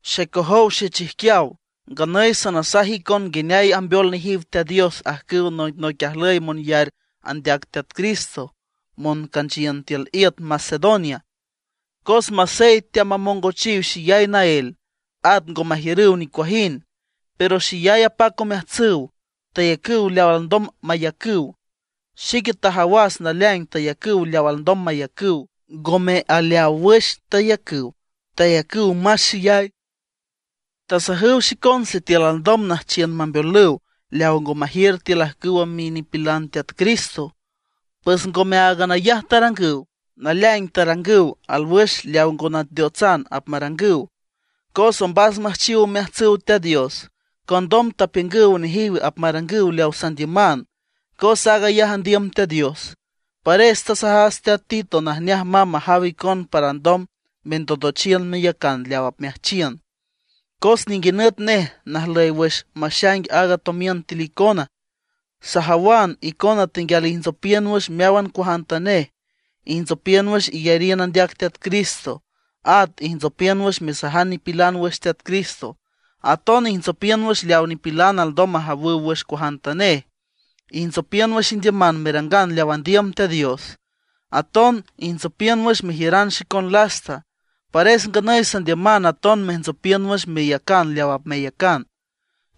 Xecojow xechijquiaw, nganüy sanasaj icon nguineay ambeol nejiw Teat Dios ajcüw noicnoic ajlüy monyar andeac Teat Cristo moncanchiün tiül iüt Macedonia. Cos masey teamamongochiw xeyay naél, at ngo majiürüw nicuajind, pero xeyay apac omeajtsüw, tayacüw leaw alndom mayacüw. Xique tajawas naleaing tayacüw leaw alndom mayacüw, ngome aleaw wüx tayacüw, tayacüw más xeyay. Tasajüw xicon sitiül alndom nüjchiün mambeolüw leaw ngo majiür tiül ajcüw minipilan Teat Cristo. Pues ngome áagan ayaj tarangüw, naleaing tarangüw alwüx leaw ngo nateotsan apmarangüw. Cos ombas müjchiw omeajtsüw Teat Dios, condom tapiüngüw nejiw apmarangüw leawa sandiüman, cos aag ayaj andiüm Teat Dios. Pares tasajas teat Tito najneaj mamb majaw icon para alndom mendondochiün meyacan leaw apmeajchiün, cos ninguinüt nej najlüy wüx maxaing aaga tomiün tiül icona. Sajawan icona tenguial ijntsopiün wüx meáwan cuajantanej: Ijntsopiün wüx iyariün andeac Teat Cristo; at ijntsopiün wüx mesajan nipilan wüx Teat Cristo; aton ijntsopiün wüx leaw nipilan alndom majawüw wüx cuajantanej; ijntsopiün wüx indiüman merangan leaw andiüm Teat Dios; aton ijntsopiün wüx mejiüran xicon lasta. Pares nganüy sandiüman aton mejntsopiün wüx meyacan leaw apmeyacan.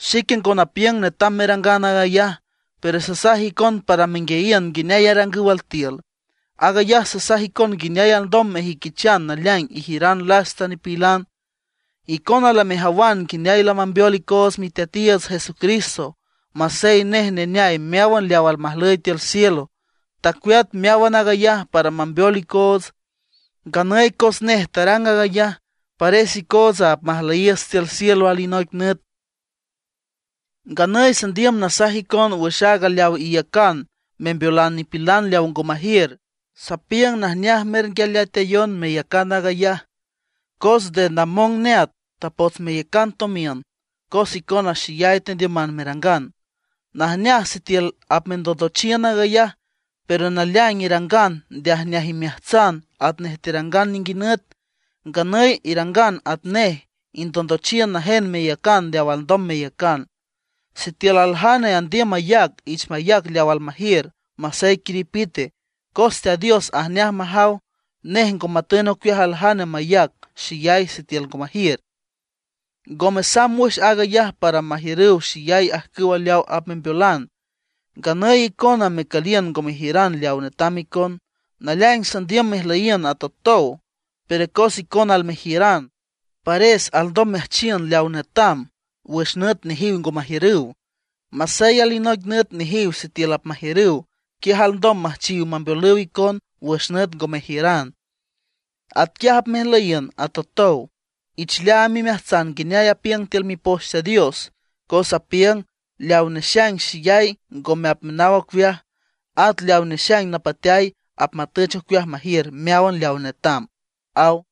Xique ngo napiüng netam merangan aag ayaj, pero sasaj icon para menguiayiün nguineay arangüw altiül. Aag ayaj sasaj icon nguineay alndom mejüiquichan naleaing ijiüran lasta nipilan. Icona lamejawan nguineay lamambeol icoots Miteatiiüts Jesucristo. Masey nej neneay meáwan leaw almajlüy tiül cielo, tacueat meáwan aag ayaj para mambeol icoots. Nganüy cos nej tarang aag ayaj, pares icootsa apmajlüyiiüts tiül cielo alinoic nüt. Nganüy sandiüm nasaj icon wüx aaga leaw iyacan membeolan nipilan leaw ngo majiür. Sapiüng najneaj mernguialeatayon meyacan aag ayaj, cos nde namong neat tapots meyacan tomiün cos icona xeyay tendiüman merangan. Najneaj sitiül apmendondochiün aag ayaj, pero naleaing irangan nde ajneaj imeajtsan atnej terangan ninguinüt. Nganüy irangan atnej, indondochiün najen meyacan leaw alndom meyacan. Sitiül aljane andiüm mayac, ich mayac leaw almajiür, masey quiripite, cos Teat Dios ajneaj majaw; nej ngo matün ocueaj aljane mayac xeyay sitiül ngo majiür. Ngome samb wüx aag ayaj para majiürüw xeyay ajcüw leaw apmembeolan, nganüy icona mecüliün ngo mejiüran leaw netam icon. Naleaing sandiüm mejlüyiün atotow. Pero cos icona almejiüran, pares alndom meajchiün leaw netam wüx nüt nejiw ngo majiürüw. Masey alinoic nüt nejiw sitiül apmajiürüw, quiaj alndom müjchiw mambeolüw icon wüx nüt ngo mejiüran. Atquiaj apmejlüyiün atotow. Ich leaam imeajtsan nguineay apiüng tiül Mipoch Teat Dios, cos apiüng: “Leaw nexaing xeyay ngome apmenaw ocueaj, at leaw nexaing napateay apmatüch ocueaj majiür meáwan leaw netam”, aw.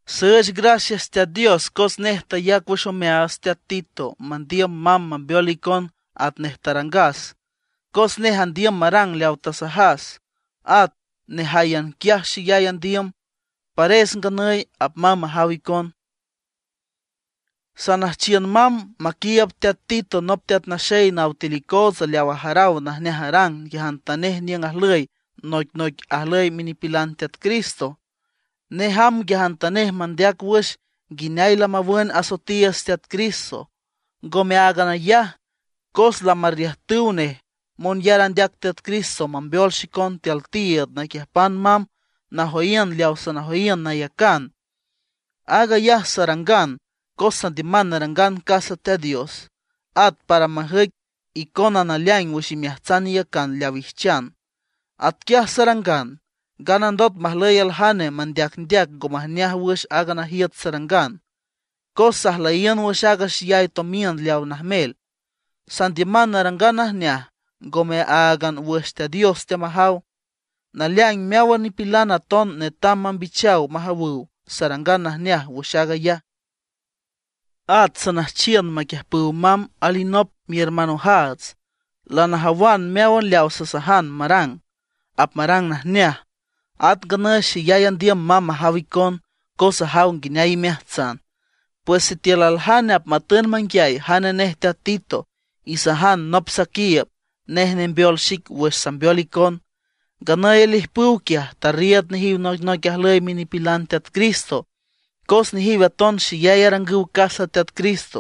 Süüch gracias Teat Dios cos nej tayac wüx omeaats teat Tito mandiüm mamb mambeol icon atnej tarangas. Cos nej andiüm marang leaw tasajas; at nejáyan quiaj xeyay andiüm; pares nganüy apmamb majaw icon. Sanüjchiün mamb maquiiüb teat Tito nop teat naxey naw tiül icootsa leaw ajaraw najneaj arang nguiajantanej niüng ajlüy noicnoic ajlüy minipilan Teat Cristo. Nej amb nguiajantanej mandeac wüx nguineay lamawün asoetiiüts Teat Cristo. Ngome áagan ayaj, cos lamarriüjtüw nej monyar andeac Teat Cristo mambeol xicon tiül tiiüd naquiüjpan mamb najoyiün leaw sanajoyiün nayacan. Aag ayaj sarangan cos sandiüman narangan casa Teat Dios, at para majüic icona naleaing wüx imeajtsan iyacan leaw ijchan. Atquiaj sarangan, nganandot majlüy aljane mandeacndeac ngo majneaj wüx aaga najiüt sarangan, cos sajlüyiün wüx aaga xeyay tomiün leawa najmel. Sandiüman narangan najneaj, ngome áagan wüx Teat Dios teamajaw, naleaing meáwan nipilan aton netam mambichaw majawüw sarangan najneaj wüx aag ayaj. At sanüjchiün maquiüjpüw mamb alinop mihermanojaats. Lanajawan meáwan leaw sasajan marang, apmarang najneaj. At nganüy xeyay andiüm mamb majaw icon, cos ajaw nguineay imeajtsan. Pues sitiül aljane apmatün manguiay jane nej teat Tito, isajan nop saquiiüb, nej nembeol xic wüx sambeol icon. Nganüy alijpüw quiaj, tarriiüd nejiw noicnoic ajlüy minipilan Teat Cristo cos nejiw aton xeyay arangüw casa Teat Cristo.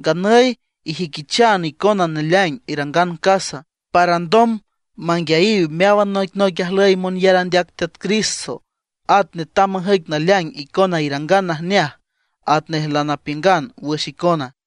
Nganüy ijüiquichan icona naleaing irangan casa, para alndom manguiayiw meáwan noicnoic ajlüy monyar andeac Teat Cristo; at netam majüic naleaing icona irangan najneaj atnej lanapiüngan wüx icona.